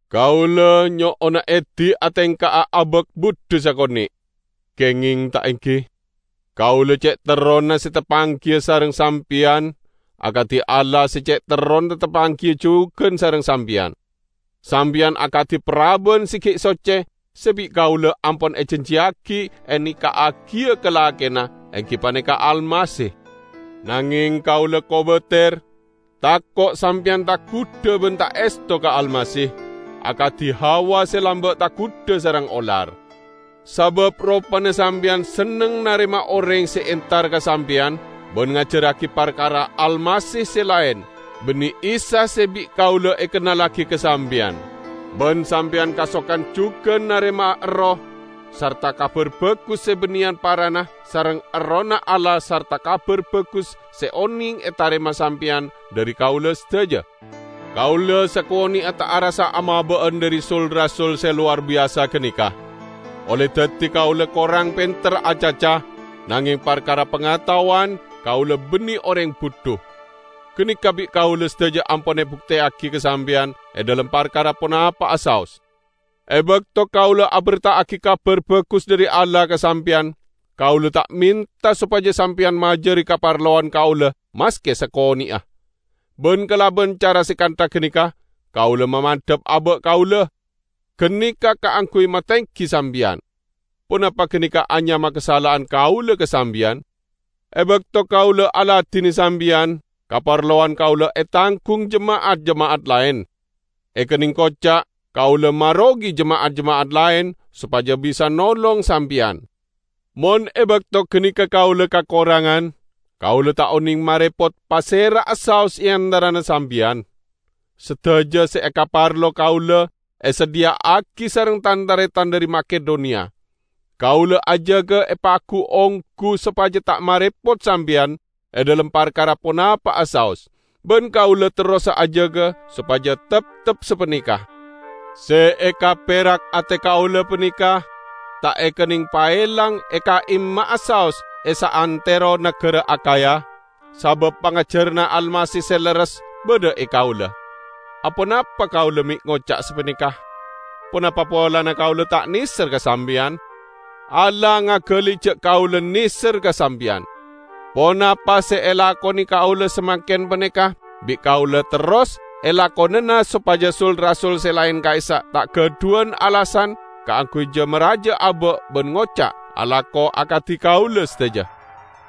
Kaula nyo'ona edi atengka'a abak budhu sakone'. Kengeng, ta' enggi? Kaula ce' terrona se tapanggiya sareng sampeyan, akadi Allah se ce' terrona tapanggiya jugan sareng sampeyan. Sampeyan akadi paraban se gi' socce se bi' kaula ampon ejanjiyagi eneka'agiya ka lakena, enggi paneka Almasih. Nangeng kaula kobater tako' sampeyan tagudha ban ta' esto ka Almasih, akadi Hawa se lamba' tagudha sareng olar. Sabab ropana sampeyan senneng narema oreng se entar ka sampeyan ban ngajarragi parkara Almasih se laen -- banne Isa se bi' kaula ekennallagi ka sampeyan. Ban sampeyan kasokan jugan narema erroh sarta "kabar bagus" se banneyan parana sareng Errohna Allah sarta Kabar Bagus se oneng etarema sampeyan dhari kaula sadaja. Kaula sakone'a ta' arassa amaba'an dhari "sul-rasul" se lowar biyasa ganeka! Olle daddi kaula korang penter acaca, nangeng parkara pangataowan, kaula banne oreng budhu. Ganeka bi' kaula sadaja ampon ebukteyagi ka sampeyan e dhalem parkara ponapa'a saos. E bakto kaula aberta'agi Kabar Bagus dhari Allah ka sampeyan, kaula ta' menta sopaja sampeyan majari kaparlowan kaula maske sakone'a; ban kalaban cara se kantha ganeka kaula mamandhap aba' kaula; ganeka kaangguy matenggi sampeyan. Ponapa ganeka anyama kasala'an kaula ka sampeyan? E bakto kaula aladine sampeyan, kaparlowan kaula etanggung jema'at-jema'at laen. Ekenneng koca' kaula marogi jema'at-jema'at laen sopaja bisa nolong sampeyan. Mon e bakto ganeka kaula kakorangan, kaula ta' oneng marepot pasera'a saos e antarana sampeyan. Sadaja se ekaparlo kaula esadhiya'agi sareng tan-taretan dhari Makedoniya. Kaula ajaga epagu-onggu sopaja ta' marepot sampeyan e dhalem parkara ponapa'a saos, ban kaula terrosa ajaga sopaja teptep sapaneka. Se ekaperak ate kaula paneka ta' ekenneng paelang e ka'imma'a saos e saantero nagara Akhaya, sabab pangajaranna Almasih se leres badha e kaula. Aponapa kaula me' ngoca' sapaneka? Ponapa polana kaula ta' neser ka sampeyan? Allah ngagali ja' kaula neser ka sampeyan! Ponapa se elakone kaula samangken paneka bi' kaula terros elakonana sopaja "sul-rasul" se laen ka'issa' ta' gadhuwan alasan kaangguy ja-maraja aba' ban ngoca' alako akadi kaula sadaja.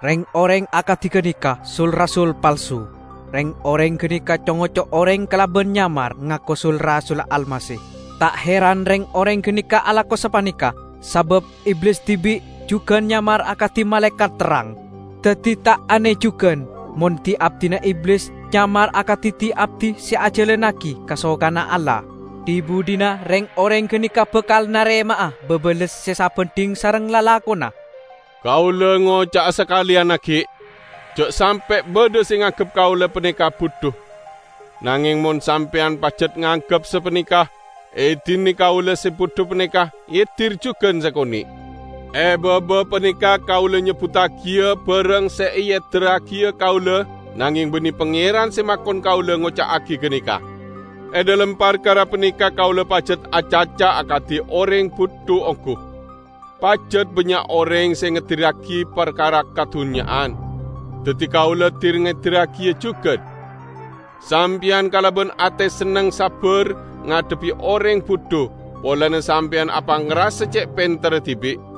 Reng-oreng akadi ganeka sul-rasul palsu; reng-oreng ganeka co-ngoco oreng kalaban nyamar ngako sul-rasulla Almasih. Ta' heran reng-oreng ganeka alako sapaneka, sabab Iblis dibi'jugan nyamar akadi malaekat terrang! Daddi ta' ane jugan mon di-abdina Iblis nyamar akadi di-abdi se ajalannagi kasokanna Allah. Dhi-budhina reng-oreng ganeka bakal narema'a babales se sabandhing sareng lalakonna. Kaula ngoca'a sakaleyan aggi': Ja' sampe' badha se nganggep kaula paneka budhu. Nangeng mon sampeyan pajat nganggep sapaneka, edine kaula se budhu paneka edir jugan sakone'. E baba paneka kaula nyebbuddagiya barang se eedirragiya kaula, nangeng banne Pangeran se makon kaula ngoca'agi ganeka. E dhalem parkara paneka kaula pajat acaca akadi oreng budhu onggu. Pajat bannya' oreng se ngedirragi parkara kadunnya'an, daddi kaula dir-ngedirragiya jugan. Sampeyan kalaban ate senneng sabbar ngadhebbi oreng budhu, polana sampeyan apangrasa ce' penterra dibi'!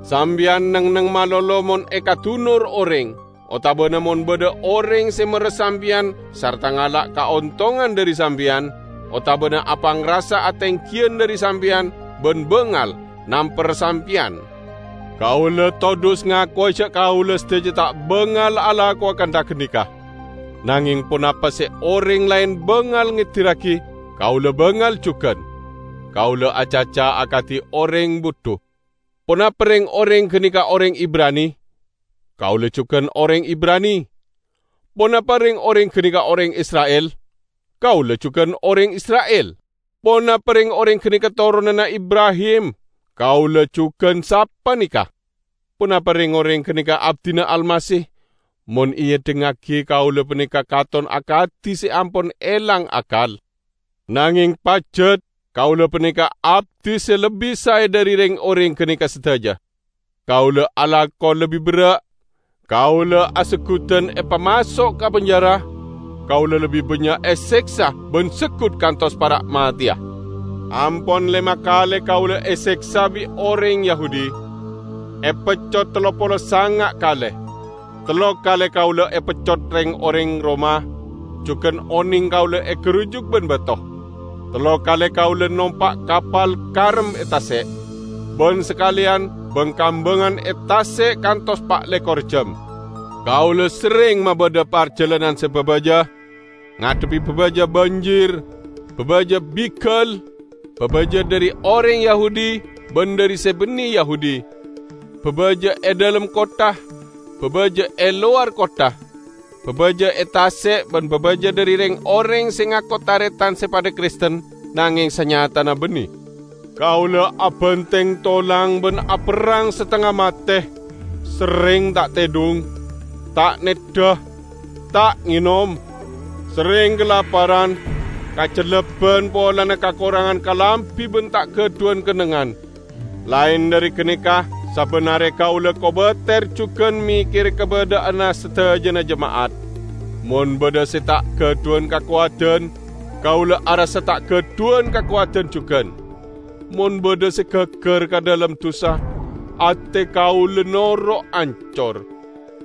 Sampeyan neng-enneng malolo mon ekadunor oreng, otabana mon badha oreng se merres sampeyan sarta ngala' kaontongan dhari sampeyan, otabana apangrasa atenggiyan dhari sampeyan ban bangal namper sampeyan. Kaula todhus ngakowa ja' kaula sadaja ta' bangal alakowa kantha ganeka. Nangeng ponapa se oreng laen bangal ngedirragi, kaula bangal jugan! (Kaula acaca akadi oreng budhu.) Ponapa reng-oreng ganeka oreng Ibrani? Kaula jugan oreng Ibrani. Ponapa reng-oreng ganeka oreng Isra'il? Kaula jugan oreng Isra'il. Ponapa reng-oreng ganeka toronanna Ibrahim? Kaula jugan sapaneka! Ponapa reng-oreng ganeka abdina Almasih? Mon eedhingngagi kaula paneka katon akadi se ampon elang akkal, nangeng pajat kaula paneka abdi se lebbi sae dhari reng-oreng ganeka sadaja! Kaula alako lebbi berra', kaula aseggudan epamaso' ka penjara, kaula lebbi bannya' eseksa ban seggut kantos para' mateya. Ampon lema kale kaula eseksa bi' oreng Yahudi, epeccot tello polo sanga' kale. Tello kale kaula epeccot reng-oreng Roma; jugan oneng kaula egarujuk ban bato. Tello kale kaula nompa' kapal karem e tase', ban sakaleyan bang-kambangan e tase' kantos pa' lekor ejjam. Kaula serreng mabadha parjalanan se babaja: ngadhebbi babaja banjir, babaja bigal, babaja dhari oreng Yahudi ban dhari se banne Yahudi, babaja e dhalem kottha, babaja e lowar kottha, babaja e tase' ban babaja dhari reng-oreng se ngako taretan se padha Kristen nangeng sanyatana banne. Kaula abanteng tolang ban aperrang satengnga mate: serreng ta' tedhung, ta neddha, ta' ngenom; serreng kalaparan, kacellebban polana kakorangan kalambi ban ta' gadhuwan kennengngan. Laen dhari ganeka sabban are kaula kobater jugan mekkere kabadha'anna sadajana jema'at. Mon badha se ta' gadhuwan kakowadan, kaula arassa ta' gadhuwan kakowadan jugan. Mon badha se gaggar ka dhalem dusa, ate kaula noro' ancor.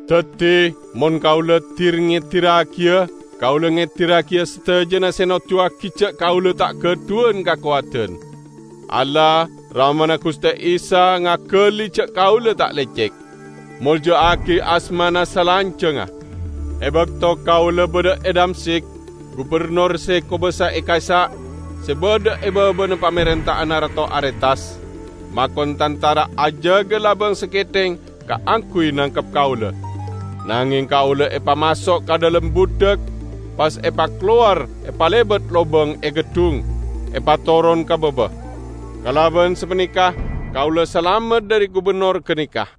Daddi, mon kaula dir-ngedirragiya, kaula ngedirragiya sadajana se noduwagi ja' kaula ta' gadhuwan kakowadan. Allah, Ramana Guste Isa ngagali ja' kaula ta' lecek. Molja'agi asmana salanjangnga. E bakto kaula badha e Damsyik, gubennor se kobasa e ka'issa', se badha e babana pamarenta'anna Rato Aretas, makon tantara ajaga labang saketheng kaangguy nangkep kaula. Nangeng kaula epamaso' ka dhalem budhak, pas epakalowar epalebat lobang e geddhung, epatoron ka baba. Kalaban sapaneka kaula salamet dhari gubennor ganeka.